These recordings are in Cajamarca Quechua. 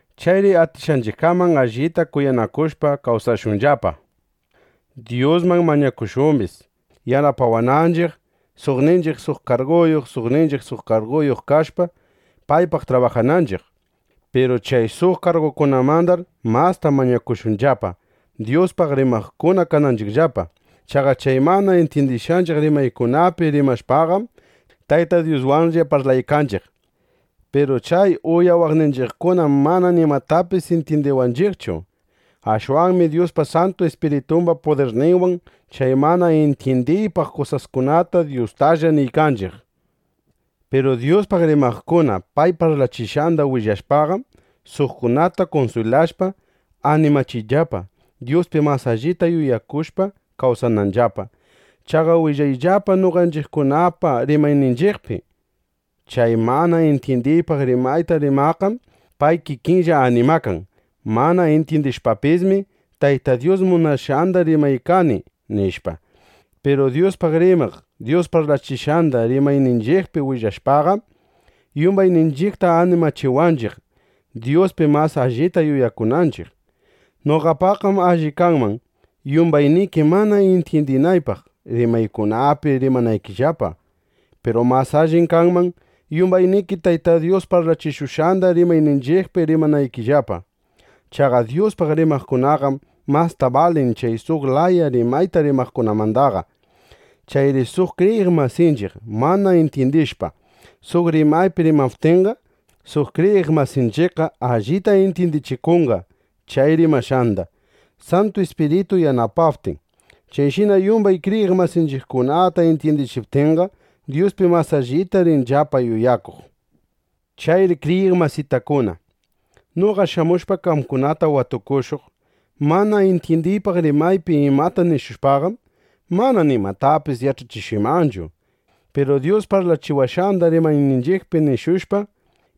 Chayri atishqanchiqkaman allita kuyanakushpa, kawsashunllapa. Dyusman mañakushumbis, yanapawananchiq, suqninchiq suq karguyuq, suqninchiq suq karguyuq kashpa, paypaq trabajananchiq. Piru chay suq kargukunamandar masta mañakushunllapa, Dyuspaq rimaqkuna kananchiqllapa. Chaqa chay mana intyindishqanchiq rimaykunapi rimashpaqam, Tayta Dyuswanlla parlaykanchiq. Piru chay uyawaqninchiqkunam mana nimatapis intyindiwanchiqchu. Ashwanmi Dyuspa Santu Ispiritumba pudirninwan chay mana intyindiypaq kusaskunata Dyustalla niykanchiq. Piru Dyuspaq rimaqkuna pay parlachishqanda willashpaqam, suqkunata kunswilashpa, animachinllapa, Dyuspi mas allita yuyakushpa kawsananllapa. (Chaqa willanllapa noqanchiqkunapa rimayninchiqpi.) Chay mana intyindiypaq rimayta rimaqqam pay kikinlla animakan: Mana intyindishpapismi, Tayta Dyus munashqanda rimaykani, nishpa. Piru Dyuspaq rimaq Dyus parlachishqanda rimayninchiqpi willashpaqam, yumbayninchiqta animachiwanchiq, Dyuspi mas allita yuyakunanchiq. Noqapaqqam alli kanman, yumbayniki mana intyindiypaq rimaykunapi rimanaykillapa. Piru mas allim kanman, yumbayniki Tayta Dyus parlachishushqanda rimayninchiqpi rimanaykillapa. Chaqa Dyuspaq rimaqkunaqam masta balin chay suq laya rimayta rimaqkunamandaqa. Chayri suq kriyiq masinchiq mana intyindishpa, suq rimaypi rimaptinqa, suq kriyiq masinchiqqa allita intyindichikunqa chay rimashqanda, Santu Ispiritu yanapaptin. Chayshina yumbay kriyiq masinchiqkunata intyindichiptinqa, Dyuspi mas allita rinllapa yuyakuq. Chayri kriyiq masitakuna, noqa shamushpa qamkunata watukushuq, mana intyindiypaq rimaypi imata nishushpaqam, mana nimatapis yach'achishuymanchu. Piru Dyus parlachiwashqanda rimayninchiqpi nishushpa,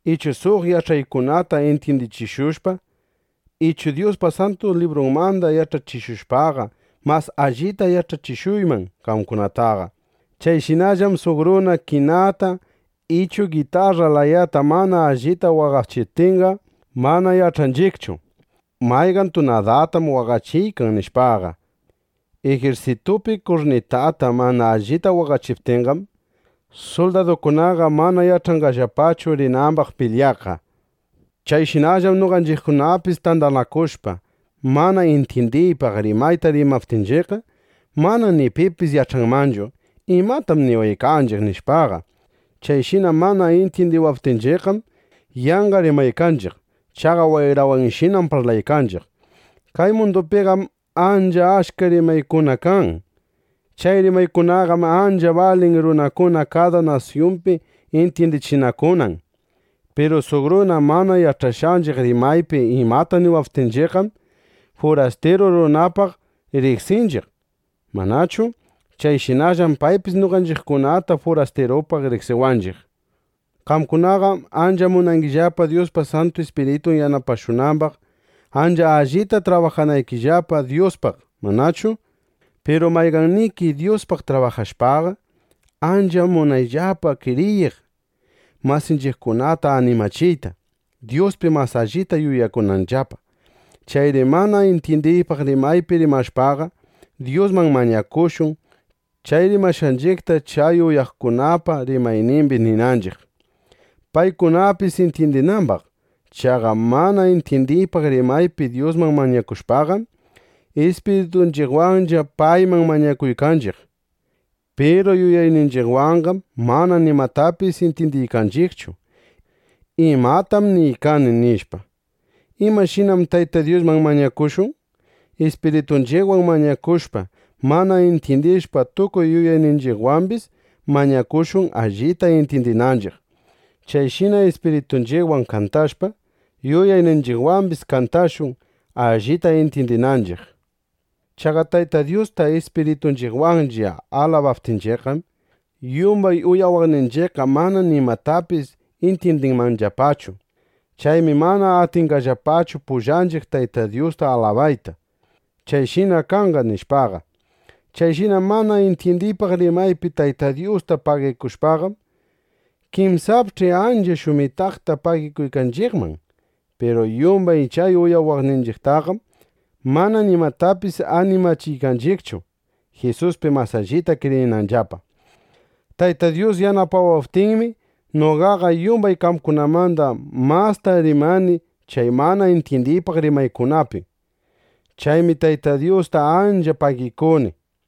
ichu suq yach'aykunata intyindichishushpa, ichu Dyuspa Santu Librunmanda yach'achishushpaqa, mas allita yach'achishuyman qamkunataqa. Chayshinallam suq runa kinata ichu gitarra layata mana allita waqachiptinqa, mana yach'anchiqchu: ¿Mayqan tunadatam waqachiykan? nishpaqa. Ijirsitupi kurnitata mana allita waqachiptinqam, suldadukunaqa mana yach'anqallapachu rinambaq pilyaqqa. Chayshinallam noqanchiqkunapis tandanakushpa, mana intyindiypaq rimayta rimaptinchiqqa, mana ni pipis yach'anmanchu: ¿Imatam niwaykanchiq? nishpaqa. Chayshina mana intyindiwaptinchiqqam, yanqa rimaykanchiq. Chaqa wayrawanshinam parlaykanchiq. Kay mundupiqam ancha achka rimaykuna kan. Chay rimaykunaqam ancha balin runakuna kada nasyumbi intyindichinakunan. Piru suq runa mana yach'ashqanchiq rimaypi imata niwaptinchiqqam, furastiru runapaq riqsinchiq, ¿manachu? Chayshinallam paypis noqanchiqkunata furastirupaq riqsiwanchiq. Qamkunaqam ancha munangillapa Dyuspa Santu Ispiritun yanapashunambaq, ancha allita trabajanaykillapa Dyuspaq ¿manachu? Piru mayqanniki Dyuspaq trabajashpaqa, ancha munayllapa kriyiq masinchiqkunata animachiyta, Dyuspi mas allita yuyakunanllapa. Chayri mana intyindiypaq rimaypi rimashpaqa, Dyusman mañakushun, chay rimashqanchiqta chay uyaqkunapa rimaynimbi ninanchiq, paykunapis intyindinambaq. Chaqa mana intyindiypaq rimaypi Dyusman mañakushpaqam, ispiritunchiqwanlla payman mañakuykanchiq. Piru yuyayninchiqwanqam mana nimatapis intyindiykanchiqchu: ¿Imatam niykani? nishpa. ¿Imashinam Tayta Dyusman mañakushun? Ispiritunchiqwan mañakushpa, mana intyindishpa, tukuy yuyayninchiqwambis mañakushun, allita intyindinanchiq. Chayshina ispiritunchiqwan kantashpa, yuyayninchiqwambis kantashun, allita intyindinanchiq. Chaqa Tayta Dyusta ispiritunchiqwanlla alabaptinchiqqam, yumbay uyawaqninchiqqa mana nimatapis intyindinmanllapachu. Chaymi mana atinqallapachu pullanchiq Tayta Dyusta alabayta: “¡Chayshina kanqa!” nishpaqa. Chayshina mana intyindiypaq rimaypi Tayta Dyusta pagikushpaqam, kinsapch'i ancha shumitaqta pagikuykanchiqman. Piru yumbay chay uyawaqninchiqtaqam mana nimatapis animachiykanchiqchu, Jisuspi mas allita kriyinanllapa. Tayta Dyus yanapawaptinmi, noqaqa yumbay qamkunamanda masta rimani chay mana intyindiypaq rimaykunapi. Chaymi Tayta Dyusta ancha pagikuni.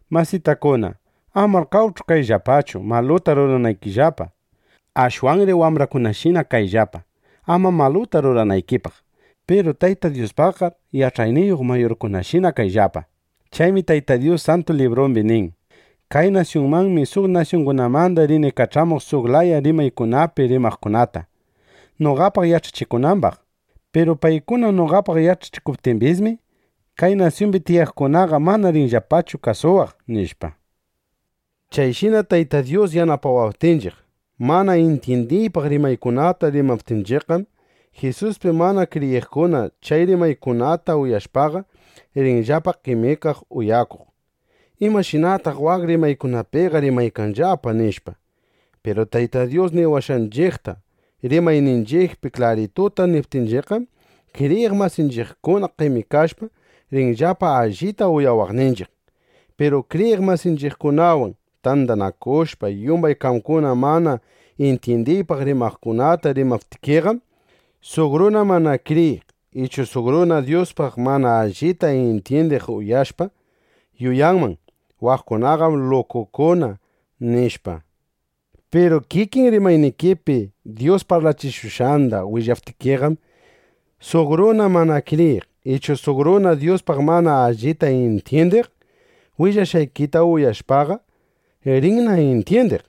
Masitakuna, amar qawch'u kayllapachu, maluta ruranaykillapa. Ashwanri wambrakunashina kayllapa, ama maluta ruranaykipaq. Piru Tayta Dyuspaqqar yach'ayniyuq mayurkunashina kayllapa. Chaymi Tayta Dyus Santu Librumbi nin: “Kay nasyunmanmi suq nasyungunamanda rini kach'amuq suq laya rimaykunapi rimaqkunata, noqapaq yach'achikunambaq. Piru paykuna noqapaq yach'achikuptimbismi, kay nasyumbi tiyaqkunaqa mana rinllapachu kasuwaq” nishpa. Chayshina Tayta Dyus yanapawaptinchiq, mana intyindiypaq rimaykunata rimananchiqqam, Jisuspi mana kriyiqkuna chay rimaykunata uyashpaqa, rinllapa qemikaq uyakuq: “¿Imashinataq waq rimaykunapiqa rimaykanllapa?” nishpa. Piru Tayta Dyus niwashqanchiqta, rimayninchiqpi klarituta niptinchiqqam, kriyiq masinchiqkuna qemikashpa, rinllapa allita uyawaqninchiq. Piru kriyiq masinchiqkunawan tandanakushpa, yumbay qamkuna mana intyindiypaq rimaykunata rimaptikiqam, suq runa mana kriyiq ichu suq runa Dyuspaq mana allita intyindiq uyashushpa, yuyanman: Waqkunaqam lukukuna, nishpa. Piru kikin rimaynikipi Dyus parlachishushqanda willaptikiqam, suq runa mana kriyiq ichu suq runa Dyuspaq mana allita intyindiq willashqaykita uyashpaqa, rinna intyindiq: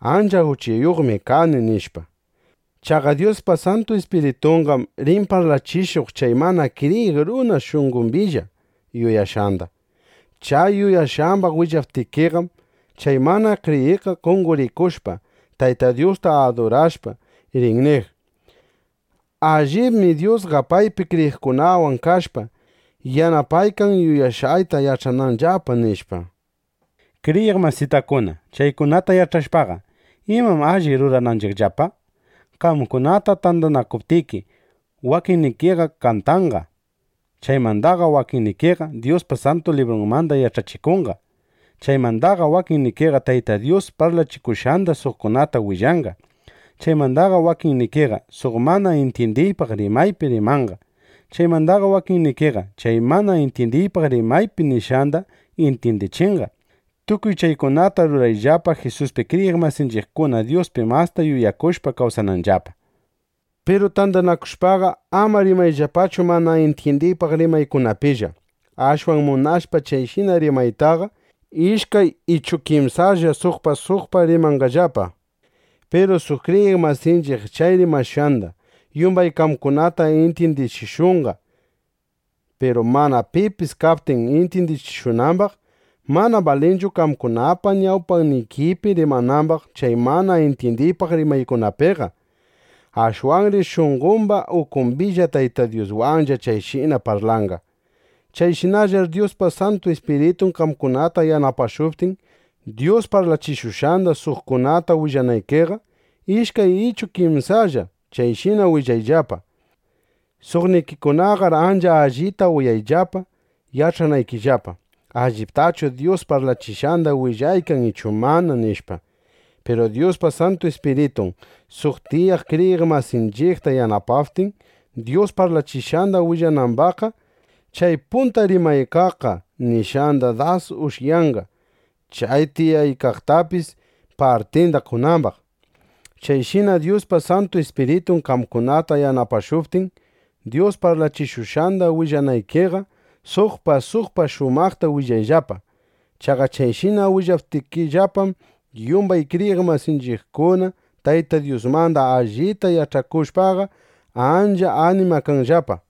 Ancha uchayuqmi kani, nishpa. Chaqa Dyuspa Santu Ispiritunqam rin parlachishuq chay mana kriyiq runa shunqombilla yuyashqanda. Chay yuyashqambaq willaptikiqam, chay mana kriyiqqa qonqorikushpa, Tayta Dyusta adurashpa, rin niq: “Allibmi Dyusqa paypi kriyiqkunawan kashpa, yanapaykan, yuyashqayta yach'ananllapa”, nishpa. Kriyiq masitakuna, chaykunata yach'ashpaqa, ¿imam alli rurananchiqllapa? Qamkuna tandanakuptiki, wakinnikiqa kantanqa. Chaymandaqa wakinnikiqa Dyuspa Santu Librunmanda yach'achikunqa. Chaymandaqa wakinnikiqa Tayta Dyus parlachishushqanda suqkunata willanqa. Chaymandaqa wakinnikiqa suq mana intyindiypaq rimaypi rimanqa. Chaymandaqa wakinnikiqa chay mana intyindiypaq rimaypi nishqanda intyindichinqa. Tukuy chaykunataqar rurayllapa, Jisuspi kriyiq masinchiqkuna Dyuspi masta yuyakushpa kawsananllapa. Piru tandanakushpaqa, ama rimayllapachu mana intyindiypaq rimaykunapillaqa. Ashwan munashpa chayshina rimaytaqa, ishkay ichu kimsalla suqpa suqpa rimanqallapa. Piru suq kriyiq masinchiq chay rimashqanda yumbay qamkunata intyindichishunqa. Piru mana pipis kaptin intyindichishunambaq, mana balinchu qamkunapa ñawpaykipi rimanambaq chay mana intyindiypaq rimaykunapiqa. Ashwanri shunqomba ukumbilla Tayta Dyuswanlla chayshina parlanqa. Chayshinallar Dyuspa Santu Ispiritun qamkunata yanapashuptin Dyus parlachishushqanda suqkunata willanaykiqa, ishkay ichu kimsalla chayshina willayllapa. Suqnikikunaqar ancha allita uyayllapa yach'anaykillapa: ¿Alliptachu Dyus parlachishqanda willaykan ichu mana? nishpa. Piru Dyuspa Santu Ispiritun suq tiyaykaq kriyiq masinchiqta yanapaptin, Dyus parlachishqanda willanambaqqa, chay punta rimaykaqqa niykashqanda das ushyanqa, chay tiyaykaqtapis partinda qonambaq. Chayshina Dyuspa Santu Ispiritun qamkunata yanapashuptin, Dyus parlachishushqanda willanaykiqa, suqpa suqpa shumaqta willayllapa. Chaqa chayshina willaptikillapam, yumbay kriyiq masinchiqkuna Tayta Dyusmanda allita yach'akushpaqa, ancha animakanqallapa.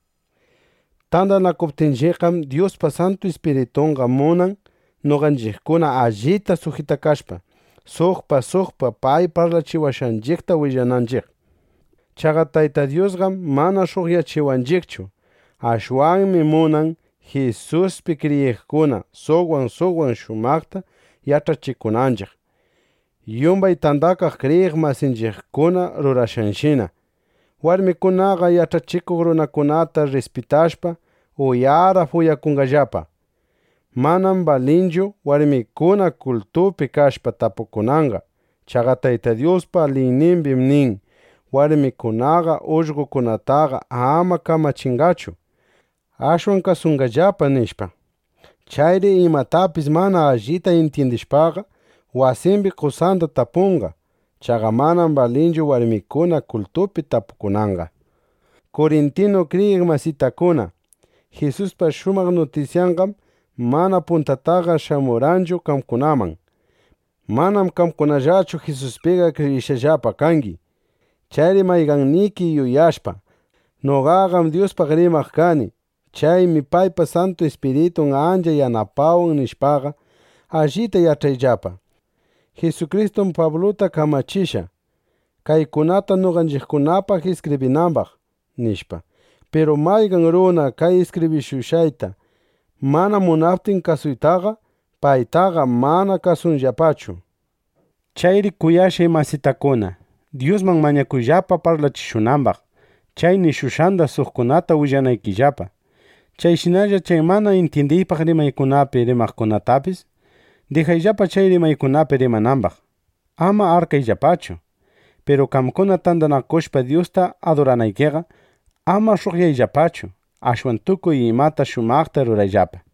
Tandanakuptinchiqqam, Dyuspa Santu Ispiritunqa munan, noqanchiqkuna allita sujitakashpa, suqpa suqpa pay parlachiwashqanchiqta willananchiq. Chaqa Tayta Dyusqam mana sh'uqyachiwanchiqchu. Ashwanmi munan, Jisuspi kriyiqkuna suqwan suqwan shumaqta yach'achinakunanchiq. Yumbay tandakaq kriyiq masinchiqkuna rurashqanshina, warmikunaqa yach'achikuq runakunata rrispitashpa, uyarap (uyara) uyakunqallapa. Manam balinchu warmikuna kultupi kashpa tapukunanqa. Chaqa Tayta Dyuspa liynimbim nin: Warmikunaqa ullqokunataqa ama kamachinqachu. Ashwan kasunqallapa, nishpa. Chayri imatapis mana allita intyindishpaqa, wasimbi qosanda tapunqa. Chaqa manam balinchu warmikuna kultupi tapukunanqa. Kurintinu kriyiq masitakuna, Jisuspa shumaq nutisyanqam mana puntataqa shamurqanchu qamkunaman. Manam qamkunallachu Jisuspiqa kriyishqallapa kangi. Chayri mayqanniki yuyashpa: Noqaqam Dyuspaq rimaq kani. Chaymi paypa Santu Ispiritun ancha yanapawan, nishpaqa, allita yach'ayllapa: Jisukristum Pabluta kamachishqa, kaykunata noqanchiqkunapaq iskibrinambaq, nishpa. Piru mayqan runa kay iskibrishushqayta mana munaptin kasuytaqa, paytaqa ama kasuyllapachu. Chayri kuyashqay masitakuna, Dyusman mañakuyllapa parlachishunambaq, chay nishushqanda suqkunata willanaykillapa. Chayshinalla chay mana intyindiypaq rimaykunapi rimaqkunatapis dijayllapa chay rimaykunapi rimanambaq. Ama arkayllapachu. Piru qamkuna tandanakushpa Dyusta aduranaykiqa, ama sh'uqyashpachu, ashwan tukuy imata shumaqta rurayllapa.